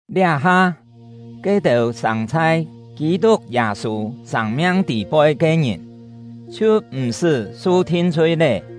Liá-ha, ke-têu sâng chhai Kî-tuk Yâ-sû sâng-miang tî-poi ke ngìn chhiu m̀-sṳ́ su thin-chhui lé.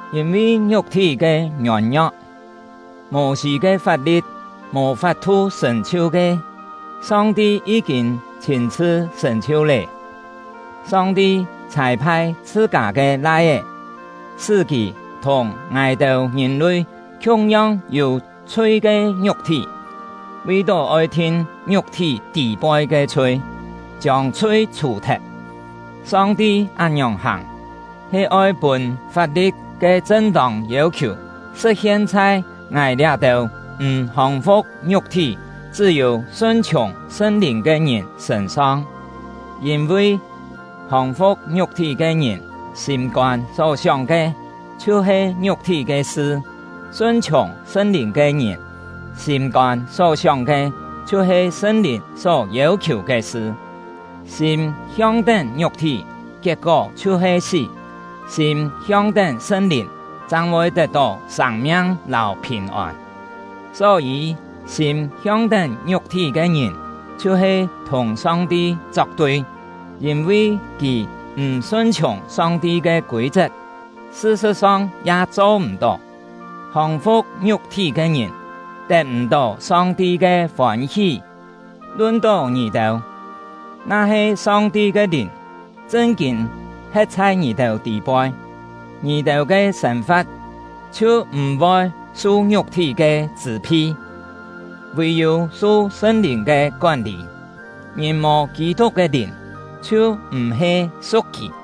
Yîn-vi ngiuk-thí ke ngiôn-ngio̍k, Mô-sî ke fap-li̍t mò fap-thu sṳ̀n-chhiu ke, Song-ti yí-kîn chhîn-chhṳ sṳ̀n-chhiu lé. Song-ti chhâi-phai chhṳ-kâ ke Lai-é, sṳ́ kì thùng ngài-têu ngìn-lui khiung-yong yû chhui ke ngiuk-thí, vi-tó oi thin ngiuk-thí tî-poi ke chhui, chiông chhui chhù-thet. Song-ti án-ngiòng hàng, he oi pûn fap-li̍t ke chṳn-tông yêu-khiù sṳ̍t-hien chhai ngài liá-têu m̀ hòng-fu̍k ngiuk-thí, chṳ́-yû sun-chhiùng Sṳn-Lìn ke ngìn sṳ̂n-song. Yîn-vi, hòng-fu̍k ngiuk-thí ke ngìn sîm-kôn só sióng ke chhiu-he ngiuk-thí ke sṳ; sun-chhiùng Sṳn-Lìn ke ngìn sîm-kôn só sióng ke chhiu-he Sṳn-Lìn só yêu-khiù ke sṳ. Sîm hiong-tén ngiuk-thí, kiet-kó chhiu-he sí; sîm hiong-tén Sṳn-Lìn, chang voi tet-tó sâng-miang lâu phìn-ôn. Só-yî, sîm hiong-tén ngiuk-thí ke ngìn chhiu-he thùng Song-ti chok-tui; yîn-vi kì m̀ sun-chhiùng Song-ti ke kûi-chet, sṳ-sṳ̍t-song ya cho m̀-tó. Hòng-fu̍k ngiuk-thí ke ngìn, tet m̀-tó Song-ti ke fôn-hí. Lun-tó ngì-têu, na-he Song-ti ke Lìn chṳn-kîn he̍t chhai ngì-têu tî-poi, ngì-têu ke sên-fa̍t chhiu m̀-voi su ngiuk-thí ke chṳ̂-phi, vì-yû su Sṳn-Lìn ke kón-lî. Ngìn mò Kî-tuk ke Lìn, chhiu m̀-he su̍k kì.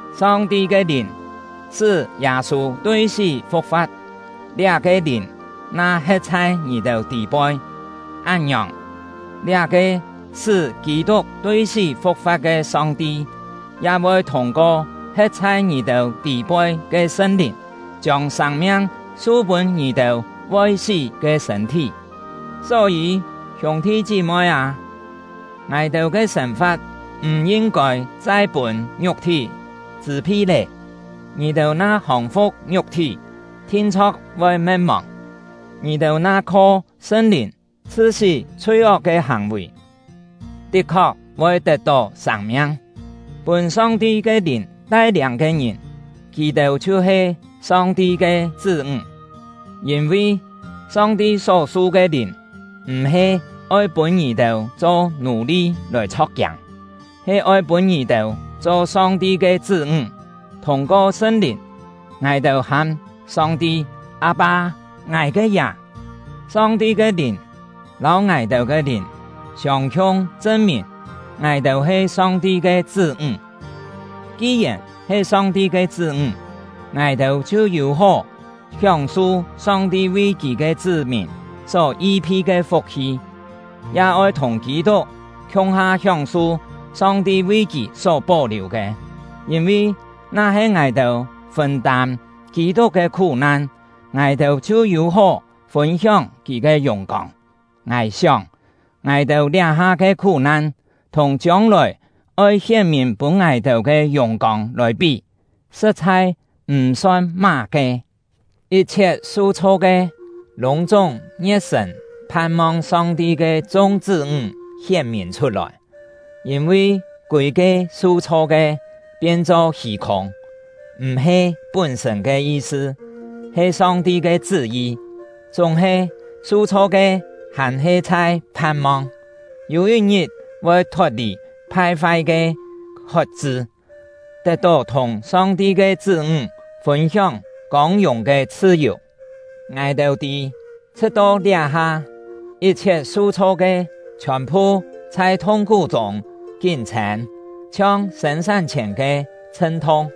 Song-ti ke Lìn sṳ́ Yâ-sû tui sí fu̍k-fa̍t; liá-ke Lìn na he̍t chhai ngì-têu tî-poi, án-ngiòng, liá-ke sṳ́ Kî-tuk tui sí fu̍k-fa̍t ke Song-ti, ya voi thûng-ko he̍t chhai ngì-têu tî-poi ke Sṳn-Lìn, chiông sâng-miang su pûn ngì-têu voi sí ke sṳ̂n-thí. Só-yî, hiûng-thi chí-moi â, ngài-têu ke sên-fa̍t m̀ yin-kôi chai pûn ngiuk-thí chṳ̂-phi lé. Ngì-têu na hòng-fu̍k ngiuk-thí, thin-chho̍k voi me̍t-mòng; ngì-têu na kho Sṳn-Lìn chhṳ-sí chhui-ok ke hàng-vì, tit-khok voi tet-tó sâng-miang. Pûn Song-ti ke Lìn tai-liâng ke ngìn, kì-têu chhiu-he Song-ti ke chṳ́-ńg. Yîn-vi, Song-ti só-su ke Lìn m̀-he oi pûn ngì-têu cho nù-li lòi chho̍k-kiâng; he oi pûn ngì-têu cho Song-ti ke chṳ́-ńg. Thûng-ko Sṳn-Lìn, ngài-têu ham Song-ti: “Â-pâ! Ngài ke Yà!” Song-ti ke Lìn lâu ngài-têu ke lìn siông-khiung chṳn-mìn ngài-têu he Song-ti ke chṳ́-ńg. Ki-yèn he Song-ti ke chṳ́-ńg, ngài-têu chhiu yû-hó hióng-su Song-ti vi Kì ke chṳ́-mìn só yi-phi ke fuk-hi, ya oi thùng Kî-tuk khiung-ha hióng-su Song-ti vi kì só pó-liù ke; yîn-vi, na-he ngài-têu fûn-tâm Kî-tuk ke khú-nan, ngài-têu chhiu yû-hó fûn-hióng kì ke yùng-kông. Ngài sióng, ngài-têu liá-ha ke khú-nan, thùng chiông-lòi oi hién-mìn pûn ngài-têu ke yùng-kông lòi pí, sṳ̍t-chhai m̀ son má-ke. Yit-chhiet su-chho ke, lûng-chúng ngie̍t-sṳ̀n phan-mong Song-ti ke chung chṳ́-ńg hién-mìn chhut-lòi. Yîn-vi kûi-ke su-chho ke pien-cho hî-khûng, m̀-he pún-sṳ̂n ke yi-sṳ, he Song-ti ke chṳ́-yi. Chúng-he, su-chho ke hàn-he chhai phan-mong, yû yit-ngit voi thot-lì phai-fai ke hot-chṳ, tet-tó thùng Song-ti ke chṳ́-ńg fûn-hióng kông-yùng ke chhṳ-yù. Ngài-têu tî, chhṳ̍t-to liá-ha, yit-chhiet su-chho ke chhiòn-phu chhai thung-khú-chûng kín-chhên, chhiong sên-sán-chhièn ke chhṳn-thung.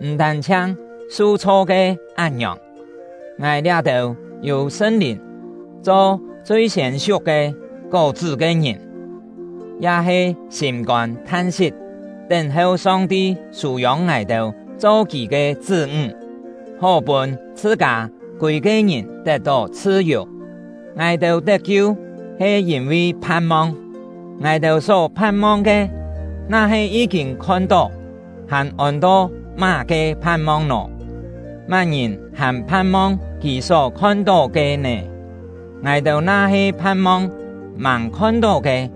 M̀ tân-chhiang su-chho ke án-ngiòng, ngài liá-têu yû Sṳn-Lìn cho chui-siên siuk ke kó-chṳ́ ke ngìn, ya he sîm-kôn than-sit, tén-heu Song-ti sû-yông ngài-têu cho Kì ke chṳ́-ńg, hó pûn chhṳ-kâ kûi-ke ngìn tet-tó chhṳ-yù. Ngài-têu tet-kiu he yîn-vi phan-mong. Ngài-têu só phan-mong ke, na-he yí-kîn khon-tó, hàn ôn-to má-ke phan-mong nò! Má-ngìn hàn phan-mong kì só khon-tó ke nè? Ngài-têu na-he phan-mong màng khon-tó ke,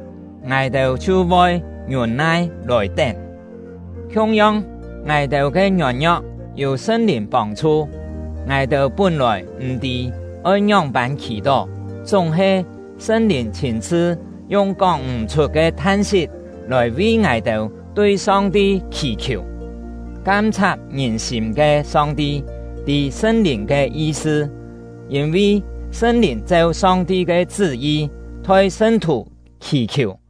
ngài-têu chhiu voi ngiûn-nai lòi tén. Khiung-yong, ngài-têu ke ngiôn-ngio̍k yû Sṳn-Lìn pông-chhu. Ngài-têu pún-lòi m̀ tî oi ngióng-pân khì-tó; chúng-he, Sṳn-Lìn chhîn-chhṳ yung kóng m̀-chhut ke than-sit lòi vi ngài-têu tui Song-ti khì-khiù. Kam-chhat ngìn-sîm ke Song-ti tî Sṳn-Lìn ke yi-sṳ, yîn-vi Sṳn-Lìn cheu Song-ti ke chṳ́-yi, thoi sṳn-thù khì-khiù.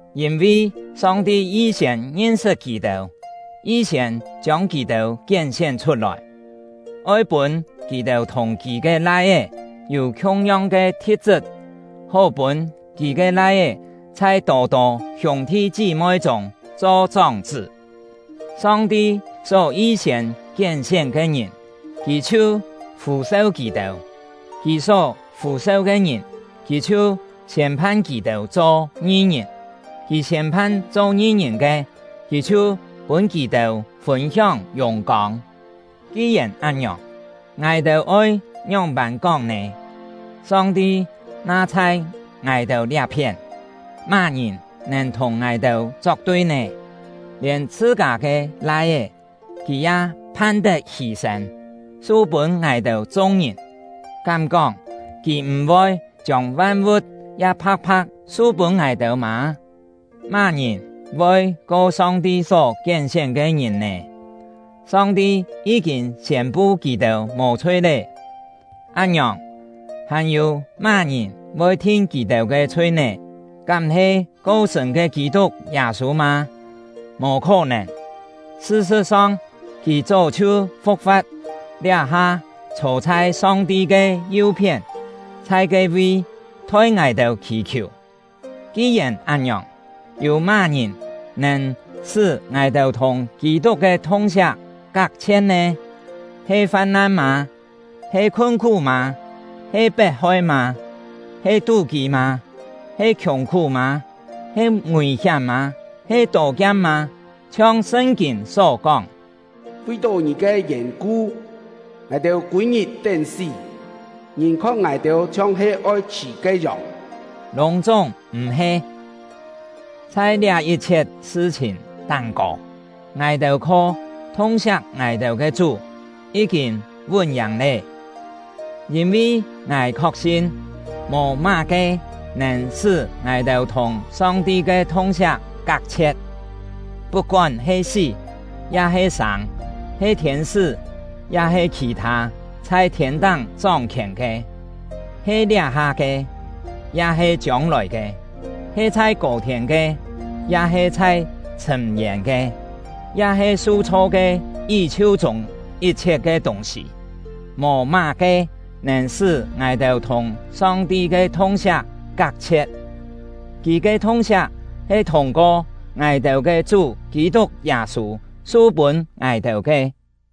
Yîn-vi Song-ti yi-siên ngin-sṳt kì-têu, yi-siên chiông kì-têu kién-sién chhut-lòi, oi pûn kì-têu thùng Kì ke Lai-é yû khiung-yong ke thi̍t-chṳt, hó pûn Kì ke Lai-é chhai tô-tô hiûng-thi chí-moi chûng cho chóng-chṳ́. Song-ti só yi-siên kién-sién ke ngìn, Kì chhiu fû-seu kì-têu; Kì só fû-seu ke ngìn, Kì chhiu siên-phan kì-têu cho ngi-ngìn; Kì siên-phan cho ngi-ngìn ke, Kì chhiu pûn kì-têu fûn-hióng yùng-kông. Ki-yèn án-ngiòng, ngài-têu oi ngióng-pân kóng nè? Song-ti na chhai ngài-têu liá-phién, má-ngìn nèn thùng ngài-têu chok-tui nè? Lièn chhṳ-kâ ke Lai-é, Kì ya phan-tet hî-sên, su-pûn ngài-têu chung-ngìn. Kám kóng Kì m̀-voi chiông van-vu̍t ya pha̍k-pha̍k su-pûn ngài-têu mâ? Má-ngìn voi ko Song-ti só kién-sién ke ngìn nè? Song-ti yí-kîn siên-pu kì-têu mò-chhui lé! Án-ngiòng, hàn-yû má-ngìn voi thin kì-têu ke chhui nè? Kám he ko-sṳ̂n ke Kî-tuk Yâ-sû mâ? Mò khó-nèn! Sṳ-sṳ̍t-song, kì chó chhiu fu̍k-fa̍t, liá-ha chhô chhai Song-ti ke yu-phién, chhai ke-vi thoi ngài-têu khì-khiù! Ki-yèn án-ngiòng, yû má-ngìn nèn sṳ́ ngài-têu thùng Kî-tuk ke thung-siak kak-chhie̍t nè? He fam-nan mâ? He khun-khú mâ? He pet-hoi mâ? He tú-kî mâ? He khiùng-khú mâ? He ngùi-hiám mâ? He tô-kiam mâ? Chhiong Sṳn-kîn só kóng: Vi-tó Ngì ke yèn-ku, ngài-têu kûi-ngit tén-sí; ngìn khon ngài-têu chhiong-he oi chhṳ̀ ke yòng. Lûng-chúng m̀-he! Chhai liá yit-chhiet sṳ-chhìn táng-kô, ngài-têu kho thung-siak ngài-têu ke Chú yí-kîn vún-yàng lé! Yîn-vi ngài khok-sin, mò má-ke nèn sṳ́ ngài-têu thùng Song-ti ke thung-siak kak-chhie̍t: Put-kón he sí, ya-he sâng; he thiên-sṳ́, ya-he khì-thâ chhai thiên-táng chóng-khièn ke; he liá-ha ke, ya-he chiông-lòi ke; he chhai kô-thiên ke, ya-he chhai chhṳ̂m-yên ke; ya-he su-chho ke yí-chhiu chûng yit-chhiet ke tûng-sî. Mò má-ke nèn sṳ́ ngài-têu thùng Song-ti ke thung-siak kak-chhie̍t; Kì ke thung-siak he thûng-ko ngài-têu ke Chú Kî-tuk Yâ-sû su-pûn ngài-têu ke.